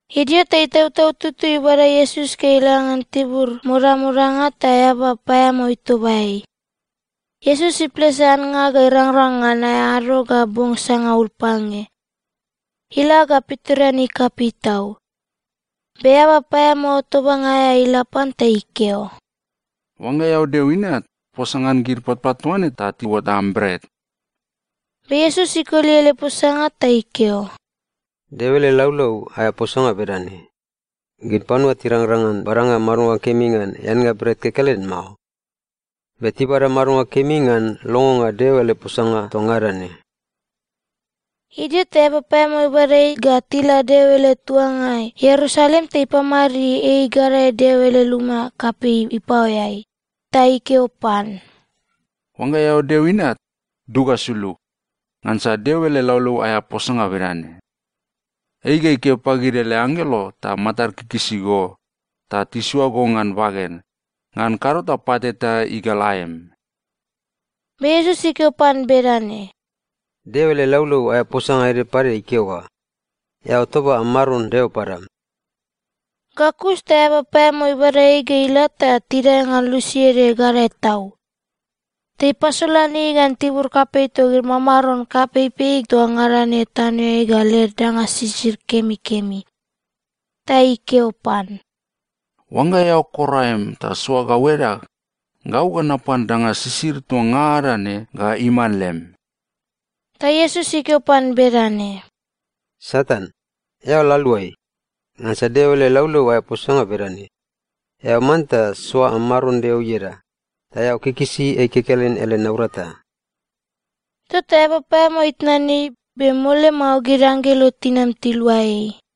Idio ta Itautau Tutui ibada Iesus ga ila ngan tibur modamodanga ta eaba paeamao itoba ei. Iesus iplese annga ga irangrang ngan aea ado ga bong sangaul pange. Ila ga pitoreanei kapei tau. Be eaba paeamao tobanga aea ila pan ta ikeo, “Oangga eao Deo Inat, posa ngan gid patpat toa ne ta tiuot am bret.” Be Iesus ikoli ele posanga ta ikeo, “Deo ele laulau aea posanga bedane, ‘Gid panua tirangrang ngan badanga madonga kemi ngan eannga bret kekelen mao. Be tibada madonga kemi ngan longonga Deo ele posanga toa ngada ne.’” Idio ta eaba paeamao ibada ei ga tila Deo ele tuangai Ierusalem ta ipamadid ei gadae Deo ele luma kapei ipaoeai. Ta ikeo pan, “Oangga eao Deo Inat, dug ga sulug. Ngansa Deo ele laulau aea posanga bedane, “‘Ei ga ikeo pagid ele anggelo ta matad ikikisi go, ta tisoa go ngan baged, ngan kado ta pat eta igal aem.’” Be Iesus ikeo pan bedane, “Deo ele laulau aea posanga ede pade ikeo ga, ‘Eao toba am Maron Deo padam.’” Ga kus ta eaba paeamao ibada ei ga ila ta tidae ngan lusi ede gadae tau. Ta ipasolan ei ngan tibur kapei togid mamaron kapeipei toa ngada ne tanoeai ga led danga sisid kemikemi. Ta ikeo pan, “Oangga eao kor aem ta soa gau edag, gau ga napan danga sisid toa ngada ne ga iman lem.” Ta Iesus ikeo pan bedane, “Satan, eao la aluai! Ngansa Deo ele laulau aea posanga bedane, ‘Eao manta soa am Maron Deo ieda, ta eao kikisi ei kekelen ele naurata.’” Tota eaba paeamao itnan ei, be mole mao gid anggelo tinam tilua ei.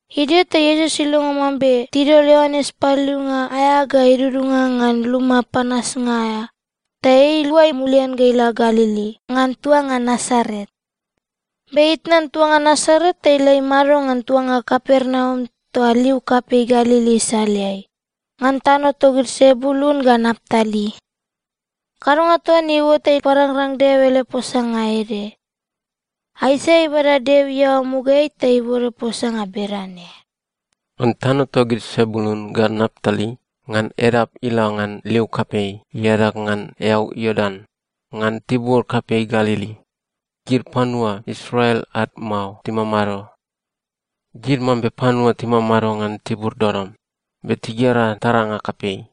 Idio ta Iesus ilongo mambe tidol Ioanes Paliliunga aea ga idudunga ngan luma panasnga aea, ta ei iluai mulian ga ila Galili ngan tuanga Nasaret. Be itnan tuanga Nasaret ta ila imado ngan tuanga Kapernaum toa liu kapei Galili isaleai, ngan tano togid Sebulun ga Naptali. Kadonga toa ne iuot ta iparangrang Deo ele posanga ede. Aisaia ibada Deo iaoa mugaeai ta ibode posanga bedane, “Ngan tano togid Sebulun ga Naptali, ngan edap ila ngan liu kapei, iadag ngan eau Iordan, ngan tibur kapei Galili, gid panua Israel ad mao timamado. Gid mambe panua timamado ngan tibur dodom, be tigera taranga kapei.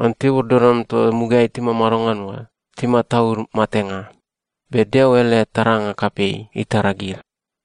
Ngan tibur dodom toa mugaeai timamado ngan oa timataud matenga, be Deo ele taranga kapei itara gid.”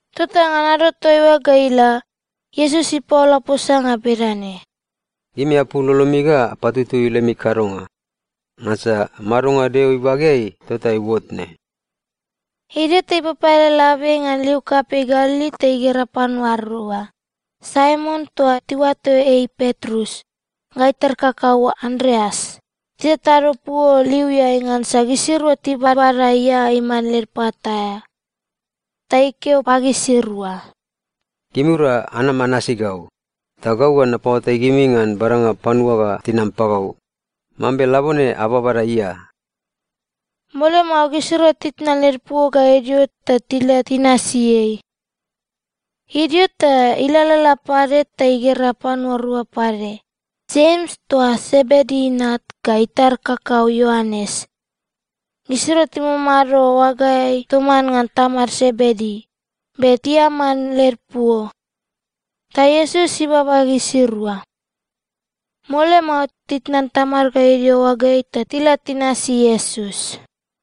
Tota ngan ado toaiua ga ila, Iesus ipaola posanga bedane, “Gimi apul lolomi ga apatutui lemi kadonga! Ngansa madonga Deo ibageai tota iuot ne.” Idio ta ipapaele labiai ngan liu kapei Galili ta igera panua rua, Saimon toa tiuato ei Petrus, ga itar kakau Andreas, titatado puo liuiai ngansa gisirua tibabada ia iman led pat aea. Ta ikeo pagisirua, “Gimirua anama anasi gau, ta gau ga napaoatai gimi ngan badanga panua ga tinam pagau, mambe labone ababada ia.” Mole mao gisirua titnan led puo ga idio, ta tila tinasi ei. Idio ta ilalala pade, ta igera panua rua pade, Jems toa Sebedi inat, ga itar kakau Ioanes. Gisirua timamado oagaeai toman ngan tamad Sebedi, be tiaman led puo. Ta Iesus ibaba gisirua. Mole mao, titnan tamad ga idio oagaeai ta tila tinasi Iesus.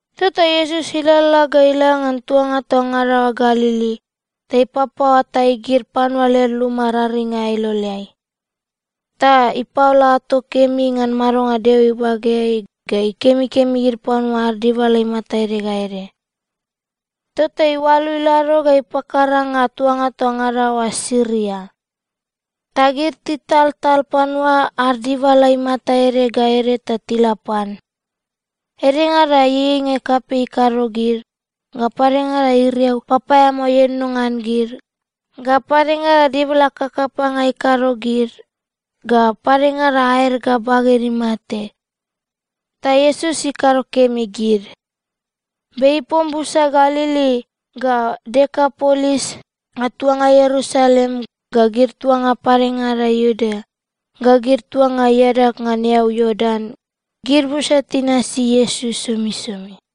Tota Iesus ilalala ga ila ngan tuanga toa ngada oa Galili, ta ipapaoatai gid panua led luma raring aea iloleai. Ta ipaola ato kemi ngan madonga Deo ibageai, ga ikemikemi gid panua ad dibala imata ede ga ede. Tota iualu ilado ga ipakaranga tuanga toa ngada oa Siria. Ta gid titaltal panua ad dibala imata ede ga ede ta tila pan. Edengada ieieinga kapei ikado gid, ga padengada iriau papaeamao ienono ngan gid, ga padengada dibala kakapanga ikado gid, ga padengada aed ga baged imate. Ta Iesus ikado kemi gid. Be ipom busa Galili, ga Dekapolis, ga tuanga Ierusalem, ga gid tuanga padengada Iudea, ga gid tuanga iadag ngan eau Iordan, gid busa tinasi Iesus somisomi.